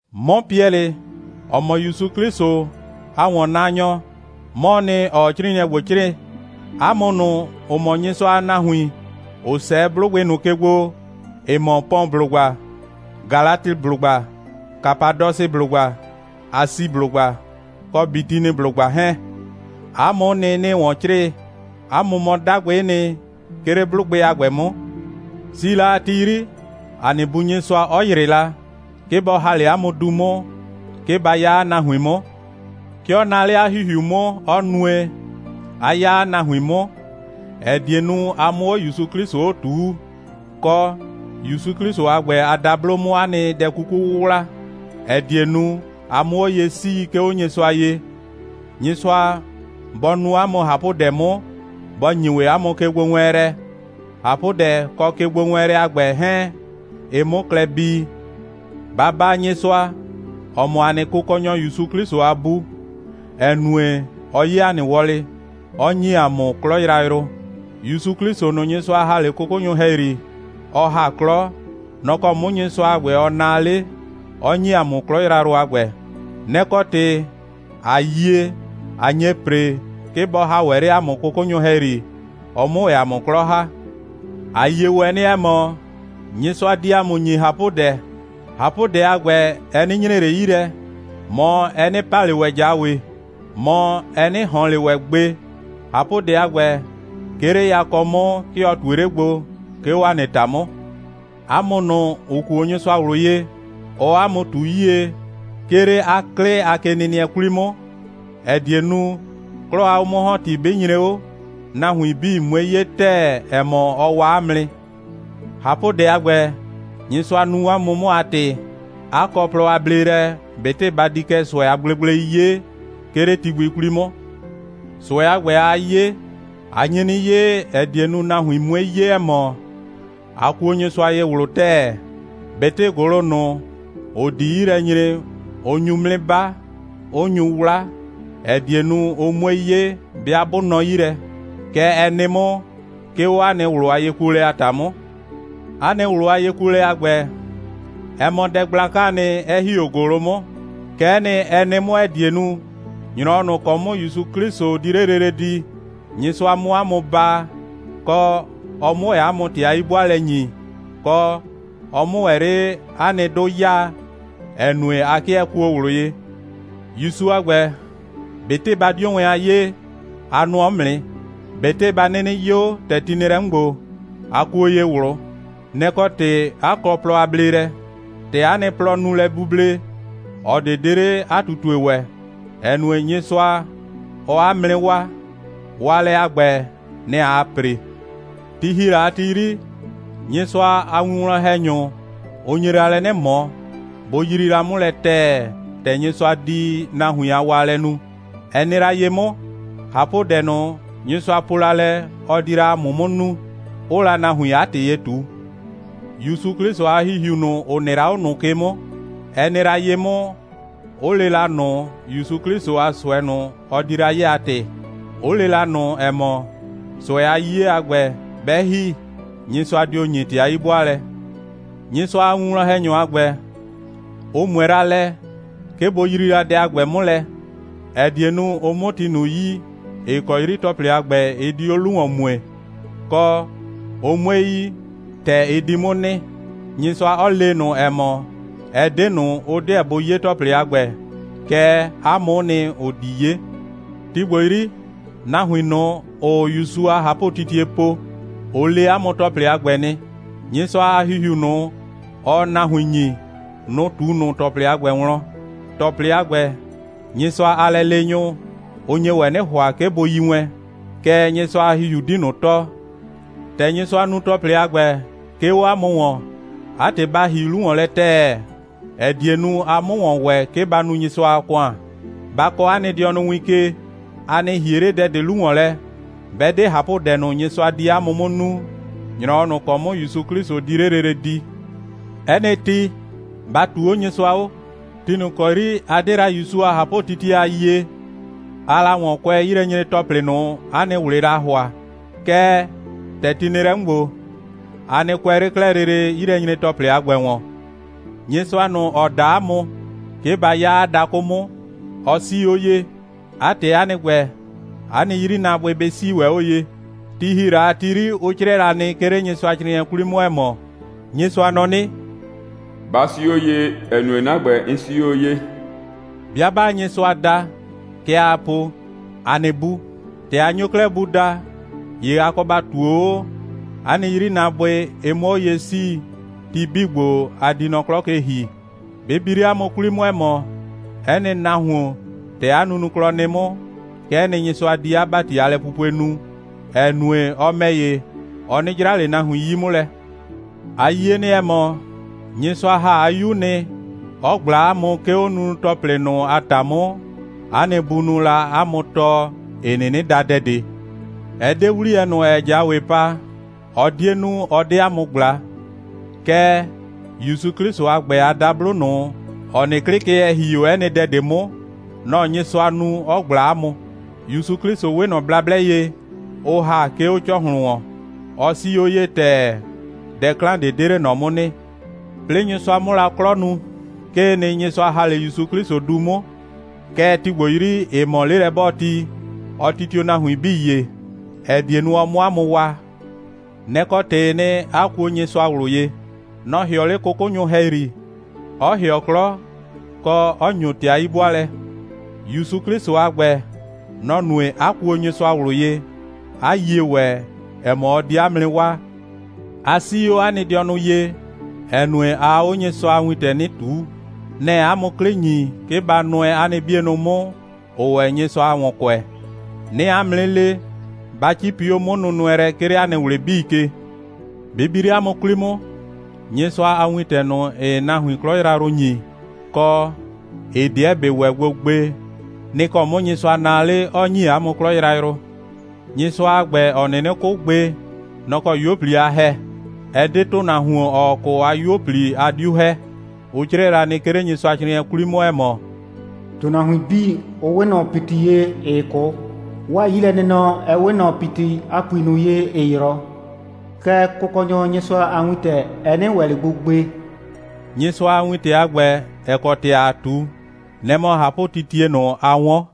'Mɔ Piɛlɩ, ‑ɔ mɔ ‑Yusu 'Klɩsʋ a ‑wɔnnaanyɔ, 'mɔɔ nɩ, ‑ɔɔ 'crɩɩnɩɛ ‑gbo 'crɩɩ. 'A mʋ ꞊nʋ, ‑ʋ mɔ Nyɩsʋa a nahuin, ‑ʋ 'sɛɛ 'blʋgbɩ ꞊nʋ ke gbo, ‑ɩ mɔ Pɔnblʋgba, Galatɩblʋgba, Kapadɔsɩblʋgba, Asiblʋgba, kɔ Bitiniblʋgba 'hɛɛn, 'a mʋ'ʋ nɩ, 'nɩɩ ‑wɔn 'crɩɩ. 'A mʋ mɔ 'dagbɩ'ɩ nɩ, 'ke 'le 'blʋgbɩ a ‑gbɛ 'mʋ. Si la a ti 'yri, ‑a nɩ Bu Nyɩsʋa 'ɔ ‑yrɩ la, 'ke bɔ ‑ha 'le 'a mʋ du 'mʋ, 'ke ba 'ya 'a nahuin 'mʋ. 'Ke ɔ naa 'le 'a ‑Hihiu 'mʋ, 'ɔ nue, 'a 'ya 'a nahuin 'mʋ, ‑ɛ die nu, a 'mʋ 'o ‑Yusu 'Klɩsʋ 'o ꞊tuu, kɔ, ‑Yusu 'Klɩsʋ a ‑gbɛ a dablo 'mʋ 'a nɩ dɛ 'kuku 'wʋwla, ‑ɛ die nu, a 'mʋ 'o ye 'sii, 'ke 'o Nyɩsʋa ye. Nyɩsʋa bɔ nu 'a mʋ ꞊hapʋdɛ 'mʋ, bɔ ‑nyi ‑wɛ 'a mʋ kegbowɛɛnlɛ, ꞊hapʋdɛ kɔ kegbowɛɛnlɛ a ‑gbɛ 'hɛɛn, ɩ 'mʋ klɛ bii. ‑Ba baa Nyɩsʋa, ‑ɔ mɔ ‑a nɩ Kʋkɔnyɔ ‑Yusu 'Klɩsʋ a Bu, ‑ɛ nue, ɔ 'ye ‑a nɩ wɔlɩ, 'ɔ ‑nyi ‑a mʋ 'klɔ yrayrʋ. ‑Yusu 'Klɩsʋ ꞊nʋ, Nyɩsʋa ‑ha 'le 'kʋkʋnyʋ ‑hɛyri, ɔ ‑ha 'klɔ, nɔ‑ kɔ 'mʋ Nyɩsʋa a ‑gbɛ, ɔ naa 'le, 'ɔ ‑nyi ‑a mʋ 'klɔ yrayrʋ a ‑gbɛ. Nɛ‑ kɔ ‑tɩ, ꞊a yie, ꞊a nye ‑pre, 'ke bɔ ‑ha ‑wɛ 'le ‑a mʋ 'kʋkʋnyʋ ‑hɛyri, ɔ 'mʋ ‑wɛ ‑a mʋ 'klɔ ‑ha. ‑A yie ‑wɛ nɩ, ‑ɛ mɔ, Nyɩsʋa di ‑a mʋ ‑nyi ꞊hapʋdɛ. ꞊Hapʋdɛ a ‑gbɛ, ɛ 'nɩ nyre ꞊le 'yi lɛ, mɔ, ɛ 'nɩ pa ꞊le ‑wɛ ꞊jawe, mɔ, ɛ 'nɩ ꞊hɔn ꞊le ‑wɛ gbe. ꞊Hapʋdɛ a ‑gbɛ, 'ke 'le yakɔ 'mʋ, 'ke ɔ ꞊tue 'le gbo, 'ke 'o 'a nɩ ‑ta 'mʋ. 'A mʋ ꞊nʋ, ‑ʋ kuo Nyɩsʋa ꞊wlʋ ye, ɔɔ 'a mʋ ꞊tu 'yie, 'ke 'le 'a 'klɩ a kenɩnɩɛ 'kwli 'mʋ, ‑ɛ die nu, 'klɔ a 'o'mʋ‑hɔnti 'bɩ nyre 'o, nahuin 'bii 'mue 'ye ‑tɛɛ, ‑ɛ mɔ, ɔ waa 'a mʋ nɩ. ꞊Hapʋdɛ a ‑gbɛ, Nyɩsʋa nu 'a mʋ 'mʋ a ‑tɩ, 'a kɔ plɔ a bleelɛ, ꞊betɩ ba di kɛ ꞊sʋɛ a gblegblei 'ye, 'ke 'le ti gbi 'kwli 'mʋ. ꞊Sʋɛ a ‑gbɛ, aa 'ye, a nye 'nɩ 'ye, ‑ɛ die nu, nahuin 'mue 'ye, ‑ɛ mɔ, a kuo Nyɩsʋa ye ꞊wlʋ ‑tɛɛ. ꞊Betɩ ‑gʋlʋ ꞊nʋ, ‑ʋ di 'yi lɛ nyre, ʋ nyu 'mʋ 'nɩ 'ba, 'ʋ nyu 'wla, ‑ɛ die nu, ʋ 'mue 'ye, 'bɩa 'bʋ nɔ 'yi lɛ. Kɛ ɛ nɩ 'mʋ, 'ke 'o 'a nɩ ꞊wlʋ a yekuolɛ a ‑ta 'mʋ. 'A nɩ ꞊wlʋ a yekuolɛ a ‑gbɛ, ɛ mɔ dɛ gblakaa nɩ, 'ɛ ‑hi 'o ‑gʋlʋ 'mʋ. Kɛ'ɛ nɩ, ɛ nɩ 'mʋ, ‑ɛ die nu, ‑nyrɔwɔ ꞊nʋ ‑kɔ 'mʋ ‑Yusu 'Klɩsʋ di 'le lele di, Nyɩsʋa 'mʋ 'a mʋ baa, kɔ, ɔ 'mʋ ‑wɛ 'a mʋ ‑tɩ a 'yi'bʋaalɛ ‑nyi, kɔ, ɔ 'mʋ ‑wɛ 'le 'a nɩ 'dʋ 'yaa, ‑ɛ nue, a 'kɩɛ kuo ꞊wlʋ ye. ‑Yusu a ‑gbɛ, ꞊betɩ ba 'dio wɛn a 'yee, a nʋɔ 'mʋ nɩ. ꞊Betɩ ba 'nɩnɩ 'yo, ‑tɛ ti nɩ lɛ 'mʋ ‑gbo, a kuo ye ꞊wlʋ. Nɛ‑ kɔ ‑tɩ, 'a kɔ plɔ a bleelɛ. ‑Tɛ 'a nɩ plɔ nu lɛ buble, ꞊ɔ ꞊de 'de 'le 'a ꞊tutue ‑wɛ, ‑ɛ nue, Nyɩsʋa, ɔɔ 'a mʋ 'nɩ waa. Waalɛ a ‑gbɛ, nɛ‑ aa ‑pre. Ti ‑hi la a ti 'yri, Nyɩsʋa a winwlɔn‑hɛnyʋ, ʋ nye la lɛ 'nɩ ꞊mɔ, bʋ yrii la 'mʋ lɛ ‑tɛɛ, ‑tɛ Nyɩsʋa di nahuin a waalɛ nu. Ɛ nɩ la ye 'mʋ, ꞊hapʋdɛ ꞊nʋ, Nyɩsʋa po la lɛ, ɔ di la 'a mʋ 'mʋ nu, 'ʋʋ la nahuin 'a ‑tɩ ye ꞊tu. ‑Yusu 'Klɩsʋ a ‑Hihiu ꞊nʋ, ‑ʋ nɩ la 'o ꞊nʋ ke 'mʋ, ɛ nɩ la ye 'mʋ, 'ʋ le la ꞊nʋ ‑Yusu 'Klɩsʋ a ꞊sʋɛ ꞊nʋ, ɔ di la 'ye a ‑tɩ, 'ʋ le la ꞊nʋ, ‑ɛ mɔ, ꞊sʋɛ a 'yiye a ‑gbɛ, 'bɛ ‑hi, Nyɩsʋa dio ‑nyi ‑tɩ a 'yi'bʋaalɛ. Nyɩsʋa a winwlɔn‑hɛnyʋ a ‑gbɛ, ʋ ꞊mʋɛ la lɛ, 'ke bʋ yrii dɛ a ‑gbɛ 'mʋ lɛ, ‑ɛ die nu, ʋ 'mʋ ti ꞊nʋ yi, ‑ɩ kɔ 'yri ‑tɔplɩ a ‑gbɛ, ɩ di 'o 'lu ‑wɔn mue, kɔ, ʋ 'mue yi, ‑tɛ ɩ di 'mʋ nɩ, Nyɩsʋa 'ɔ le ꞊nʋ, ‑ɛ mɔ, ɛ 'de ꞊nʋ, ʋ 'deɛ bʋ 'ye ‑tɔplɩ a ‑gbɛ, kɛɛ, 'a mʋ'ʋ nɩ, ‑ʋ di 'ye. Ti ‑gbo 'yri, nahuin ꞊nʋ, ‑ʋʋ ‑Yusu a ꞊hapʋtitie po, ʋ le 'a mʋ ‑tɔplɩ 'bii a ‑gbɛ nɩ. Nyɩsʋa a ‑Hihiu ꞊nʋ, ɔɔ nahuin ‑nyi, nʋ‑ ꞊tu ꞊nʋ ‑tɔplɩ a ‑gbɛ wlɔn. ‑Tɔplɩ a ‑gbɛ, Nyɩsʋa a lɛleenyʋ, ʋ nye ‑wɛ 'nɩ ‑hʋa, 'ke bʋ yi wɛn, kɛɛ, Nyɩsʋa a ‑Hihiu 'di ꞊nʋ tɔɔ. ‑Tɛ Nyɩsʋa nu ‑tɔplɩ a ‑gbɛ, 'ke 'o 'a mʋ ‑wɔn, 'a ‑tɩ, ba ‑hi 'lu ‑wɔn lɛ ‑tɛɛ, ‑ɛ die nu, a 'mʋ ‑wɔn ‑wɛ, 'ke ba nu Nyɩsʋa a ‑kʋan. Ba kɔɔ 'a nɩ dɩɔnʋ win ke! A nɩ ‑hie 'le dɛ ꞊de 'lu ‑wɔn lɛ, 'bɛ 'de ꞊hapʋdɛ ꞊nʋ, Nyɩsʋa di 'a mʋ 'mʋ nu, ‑nyrɔwɔ ꞊nʋ ‑kɔ 'mʋ ‑Yusu 'Klɩsʋ di 'le lele di. 'Ɛ nɩ ti, ba ꞊tuu 'o Nyɩsʋa 'o. Ti ꞊nʋ ‑kɔ 'yri a 'de la ‑Yusu a ꞊hapʋtitie a yie, aa la ‑wɔn kʋɛ 'yilɛnyre‑tɔplɩ ꞊nʋ, 'a nɩ ꞊wlɩɩ la ‑hʋa. Kɛɛ, ‑tɛ ti nɩ lɛ 'mʋ ‑gbo, a nɩ kʋɛ 'le 'klɛɛ lele 'yilɛnyre‑tɔplɩ a ‑gbɛ ‑wɔn. Nyɩsʋa ꞊nʋ, ‑ɔ da 'a mʋ, 'ke ba 'ya 'a dakʋ 'mʋ, ɔ 'sii 'o ye. 'A ‑tɩ, 'a nɩ ‑gbɛ, 'a nɩ 'yrinaabʋɩ bɩ 'sii ‑wɛ 'o ye. Ti ‑hi la a ti 'yri, ʋ 'crɩɛ la nɩ, 'ke 'le Nyɩsʋacrɩɩnɩɛ 'kwli 'mʋ, ‑ɛ mɔ: «Nyɩsʋa nɔ 'nɩ: Ba 'sii 'o ye, ‑ɛ nue, 'na ‑gbɛ, 'n 'sii 'o ye.» 'Bɩa 'baa Nyɩsʋa da, kɛ aa po: «‑A nɩ Bu.» ‑Tɛ a nyo 'klɛɛ Bu daa, ‑ye a kɔ ba ꞊tuo 'o, 'a nɩ 'yrinaabʋɩ, ɩ 'mʋ 'o ye 'sii, ti 'bii ‑gbo, a di nɔ 'klɔ ke ‑hi. Bɩ bi 'le 'a mʋ 'kwli 'mʋ, ‑ɛ mɔ, 'ɛ nɩ nahuon, ‑tɛ 'a nunuklɔ nɩ 'mʋ, kɛ'ɛ nɩ, Nyɩsʋa di 'a ‑bati a lɛpupue nu, ‑ɛ nue, ɔ ‑mɛ ‑ye, ɔ 'nɩ 'jra ꞊le nahuin 'yi 'mʋ lɛ. A yie nɩ, ‑ɛ mɔ, Nyɩsʋa ‑ha 'a 'Yu nɩ, 'ɔ ꞊gbla 'a mʋ, 'ke 'o nunu‑tɔplɩ ꞊nʋ a ‑ta 'mʋ, 'a nɩ bunʋʋ la 'a mʋ tɔɔ, ‑ɩ 'nɩnɩ da dɛ ꞊de. Ɛ 'de 'wliyɛ ꞊nʋ, ‑ɛɛ ꞊jawe pa, ɔ 'die nu, ɔ 'de 'a mʋ ꞊gbla, kɛɛ, ‑Yusu 'Klɩsʋ a ‑gbɛ a dablo ꞊nʋ, ‑ɔ nɩ 'klɩ ke, ‑ɛ ‑hi 'o 'ɛ nɩ dɛ ꞊de 'mʋ, nɔ‑ Nyɩsʋa nu, 'ɔ ꞊gbla 'a mʋ. ‑Yusu 'Klɩsʋ 'we ꞊nɔ blablɛ ye, ʋ ‑ha, 'ke 'o ‑cɔhlʋn ‑wɔn. Ɔ 'sii 'o ye ‑tɛɛ. Dɛ 'klan ꞊de 'de 'le ꞊nɔ 'mʋ nɩ. 'Plɩɩ Nyɩsʋa 'mʋ la 'klɔ nu, 'kee nɩ, Nyɩsʋa ‑ha 'le ‑Yusu 'Klɩsʋ du 'mʋ. Kɛɛ, ti ‑gbo 'yri, ‑ɩ mɔ 'lelɛ'bɔɔti, ɔ titio nahuin 'bii ye, ‑ɛ die nu, ɔ 'mʋ 'a mʋ waa. Nɛ‑ kɔ ‑tɩɩ nɩ, 'a kuo Nyɩsʋa ꞊wlʋ ye. Nɔ‑ ‑hɩɔ 'le 'kʋkʋnyʋ ‑hɛyri, 'ɔ ‑hɩɔ 'klɔ, kɔ, 'ɔ ‑nyo ‑tɩ a 'yi'bʋaalɛ. ‑Yusu 'Klɩsʋ a ‑gbɛ, nɔ‑ nue, 'a kuo Nyɩsʋa ꞊wlʋ ye, 'a yie ‑wɛ, ‑ɛ mɔ, ɔ di 'a mʋ 'nɩ waa. A 'sii 'o 'a nɩ dɩɔnʋ ye, ‑ɛ nue, aa 'o Nyɩsʋa a wintɛ 'nɩ ꞊tuu. Nɛ‑ɛ 'a mʋ 'klɩ ‑nyi, 'ke ba nʋɛ 'a nɩ 'bienʋ 'mʋ, ‑ʋʋ ‑wɛ Nyɩsʋa ‑wɔn kʋɛ. 'Nɩɩ 'a mʋ 'nɩ le, ba 'cipi 'o 'mʋnʋnʋɛlɛ, 'ke 'le 'a nɩ ꞊wlɩ 'bii ke. Bɩ bi 'le 'a mʋ 'kwli 'mʋ, Nyɩsʋa a wintɛ ꞊nʋ, ‑ɩɩ nahuin 'klɔ yrayrʋ ‑nyi, kɔ, ‑ɩ 'deɛ ‑bɩ ‑wɛ gbo gbe, nɩ‑ kɔ 'mʋ Nyɩsʋa naa 'le, 'ɔ ‑nyi 'a mʋ 'klɔ yrayrʋ. Nyɩsʋa a ‑gbɛ, ‑ɔ 'nɩnɩ 'kʋ gbe, nɔ‑ kɔ 'yuo꞊pli a ‑hɛ. Ɛ 'de ‑tʋnahuon, ‑ɔɔ 'kʋ a 'yuo꞊pli, a 'diu ‑hɛ. Ʋ 'crɛɛ la nɩ, 'ke 'le Nyɩsʋacrɩɩnɩɛ 'kwli 'mʋ, ‑ɛ mɔ: «‑Tʋnahuin 'bii, ʋ 'we ꞊nɔ ‑piti ye, ‑ɩɩ 'kʋ. 'Waa 'yilɛnɩnɔ, ɛ 'we ꞊nɔ ‑piti a ‑pui ꞊nʋ ye, ‑ɩɩ 'yrɔ. Kɛɛ, Kʋkɔnyɔ Nyɩsʋa a wintɛ, ɛ 'nɩ ‑wɛ ꞊le gbo gbe.» Nyɩsʋa a wintɛ a ‑gbɛ, ‑ɛ kɔ ‑tɩ ‑aa ꞊tu, nɛ‑ mɔ ꞊hapʋtitie ꞊nʋ, a 'wɔn.